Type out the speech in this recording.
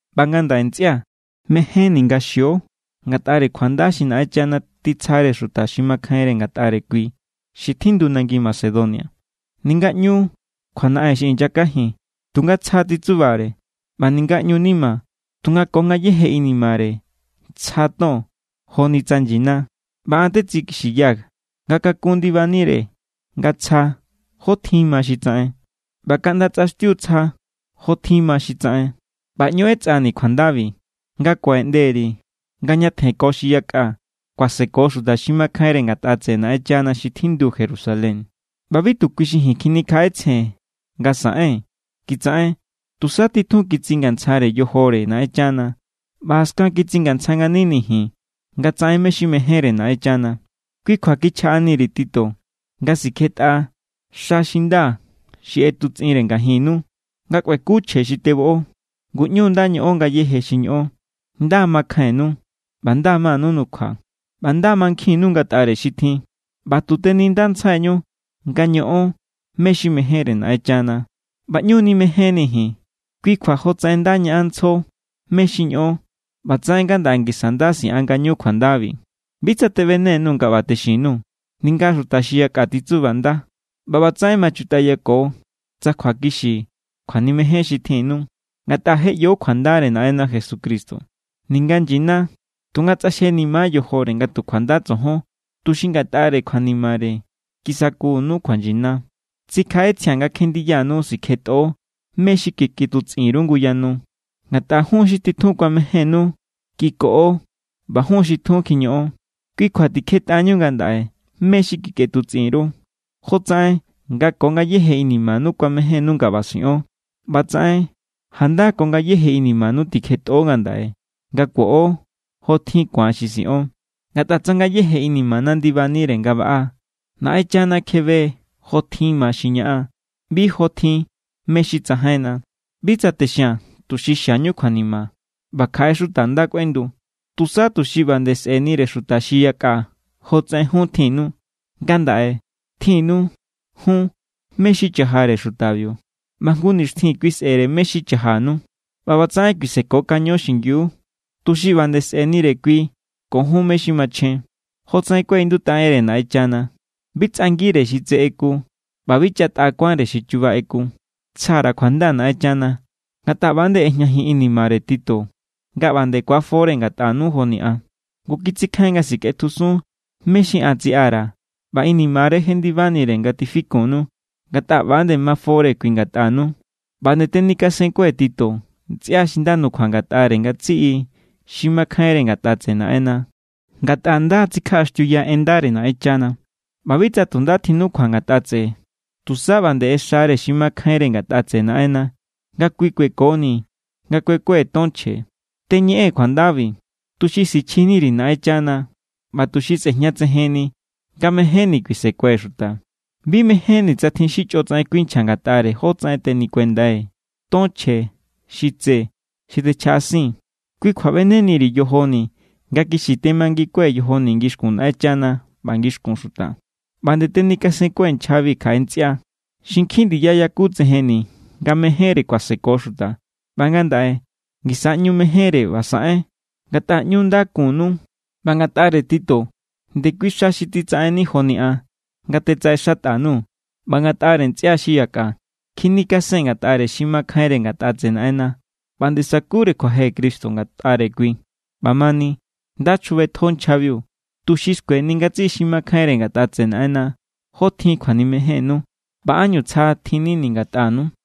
ꞌBa ngandaꞌe ntsꞌia̱, mejénni̱ nga xio ngatꞌare kjuanda xi Naꞌenchana titsjare xuta xi makjainre ngatꞌare kui xi tjindu nangi Macedonia. Ninga ꞌñu kjuanaꞌen xi inyakajin, tunga tsja titsubare. ꞌBa ninga ꞌñu nima, tunga ko ngayéje inimare tsja ton joni tsa nyina. ꞌBa an tetsikixiyaa̱ nga kakun ndibanire nga tsja jó tjin ma xi tsaꞌen, ꞌba kaꞌnda tsꞌaxtiu tsja jó tjin ma xi tsaꞌen. ꞌBa ꞌñu ꞌetsꞌani̱ kjuandabi nga kuaꞌeꞌnde_ri̱ nga ñatjen ko xi yakꞌa kuaseko xuta xi makjainre ngatꞌa tseꞌe Naꞌenchana xi tjindu Jerusalén. ꞌBa bi tu kui xi ji̱n kjinikjaꞌetsjee̱n nga saꞌen kitsaꞌen. Tusa titjun kitsingantsjare yojore Naꞌenchana ꞌba jaskan kitsingantsja nganini̱ ji̱n nga tsaꞌen mé= xi mejénre Naꞌenchana. Kui kjua kichjaꞌani_ri̱ Tito nga sikjetꞌa xa xi nda xi ꞌetutsꞌinre ngajinnu, nga kꞌueku chje xi teboꞌo. Ngu ꞌñu nda ñoꞌon ngayéje xi ñoꞌon. Nda= makjainnu, ꞌba nda= manu nukjua, ꞌba nda= mankjinnu ngatꞌare xi tjin, ꞌba tu tenindantjsaiñu nga ñoꞌon mé= xi mejénre Naꞌenchana, ꞌba ꞌñu nimejénnii̱ ji̱n. Kui kjua jotsaꞌen nda ñaꞌanntsjo mé= xi ñoꞌon, ꞌbatsaꞌen ngandaꞌe ngisa nda siꞌan ngañu kjuandabi. Bi tsa teꞌbene_nuu̱ nga ꞌba texin_nuu̱, ninga xuta xi yakꞌa titsubanda. ꞌBa ꞌbatsaꞌen ma chutꞌayako tsa kjuakixi kjuanimejen xi tjinnu. Ngatꞌa je ꞌyo kjuandare Naꞌenna Jesucristo. Ninga nyina, tunga tsꞌaxjenima yojore nga tu kjuanda tsojon, tuxi ngatꞌare kjuanimare kisakunu kjuanyina. Tsikjaꞌetsjia̱n nga kjendiyanu sikjetꞌo mé= xi kikꞌetutsꞌin_ru nguyanu, ngatꞌa jun= xi titjun kuamejénnu kikoꞌo ꞌba jun= xi tjun kjiñoꞌon. Kui kjua tikjetꞌañu ngandaꞌe mé= xi kikꞌetutsꞌin_ru. Jotsaꞌen nga ko ngayéje inimanu kuamejénnu nga ꞌba siꞌon, ꞌbatsaꞌen janda ko ngayéje inimanu tikjetꞌo ngandaꞌe nga kuoꞌo jotjin ku̱an xi siꞌon. Ngatꞌa tsa ngayéje inimana ndibanire nga baꞌa, Naꞌenchana kjebe= jotjin ma xi ñaꞌan, bi jotjin mé= xi tsajainna. Bi tsa texia̱n tuxi xiañu kjuanima ꞌba kjaꞌe xuta nda kꞌuendu, tusa tuxi ꞌba nde sꞌe̱nire xuta xi yakꞌa jotsaꞌen jun tjinnu. Ngandaꞌe tjinnu jun mé= xi chajare xutabiu, ꞌba jngu nixtjin kui sꞌe̱re mé= xi chajanu. ꞌBa ꞌbatsaꞌen kuisekokaño xingiu, tuxi ꞌba nde sꞌe̱nire kui ko jun mé= xi machjen. Jotsaꞌen kuaꞌindutꞌa enre Naꞌenchana: “Bi tsꞌangire xi tse ꞌeku, ꞌba bi chatꞌa kuánre xi chuba ꞌeku.” Tsja_ra̱ kjuanda Naꞌenchana, ngatꞌa ꞌba nde ꞌejñajin inimare Tito nga ꞌba nde ku̱afore ngatꞌanu joni an. Ngu kitsikjain nga sikꞌetjusun mé= xi an tsiꞌa_ra̱ ꞌba inimare= jendibanire nga tifikunnu, ngatꞌa ꞌba=nde mafore kui ngatꞌanu. ꞌBa nde tenikasenkue̱ Tito ntsꞌia xi nda nukjua ngatꞌare ngatsiꞌi xi makjainre ngatꞌa tseꞌe Naꞌenna, ngatꞌa nda= tsikjaꞌaxtiuya en ndare Naꞌenchana. ꞌBa bi tsa tu nda tjinukjua ngatꞌa tseꞌe, tusa ꞌba nde ꞌexare xi makjainre ngatꞌa tseꞌe Naꞌenna nga kui kuekoni̱ nga kuekue̱ ton chje. Teñeꞌee̱n kjuandabi, tuxi sichjini_ri̱ Naꞌenchana ꞌba tuxi sꞌe̱jñatsejenni nga mejénni̱ kuisekue̱ xuta. Bi mejénni̱ tsa tjin xi chꞌotsaꞌen kuinchja ngatꞌare jótsaꞌen tenikuendai̱ ton chje xi tse xi techjaꞌasii̱n. Kui kjua ꞌbeneni_ri̱ yojoni̱ nga kixi temangikue̱ yojoni̱ ngixkun Naꞌenchana ꞌba ngixkun xuta. ꞌBa nde tenikasenkue̱ nchjabi kjaꞌe ntsꞌia xi nkjin ndiya yakutsejenni̱ nga mejénre kuaseko xuta. ꞌBa ngandaꞌe ngisa ꞌñu mejénre ꞌba saꞌen, ngatꞌa ꞌñu nda kunnu. ꞌBa ngatꞌare Tito, ndekui xa xi titsaꞌenni joni an nga tetsaꞌexatꞌa_nuu̱. ꞌBa ngatꞌare ntsꞌia xi yakꞌa, kjinikasen ngatꞌare xi makjainre ngatꞌa tseꞌe Naꞌenna, ꞌba nde sakure kjuaje Cristo ngatꞌare kui. ꞌBamani, nda chjubetjo nchjabiu, tuxi skueni ngatsiꞌi xi makjainre ngatꞌa tseꞌe Naꞌenna jó tjin kjuanimejénnu ꞌba ánñu tsja tjinnini̱ ngatꞌanu.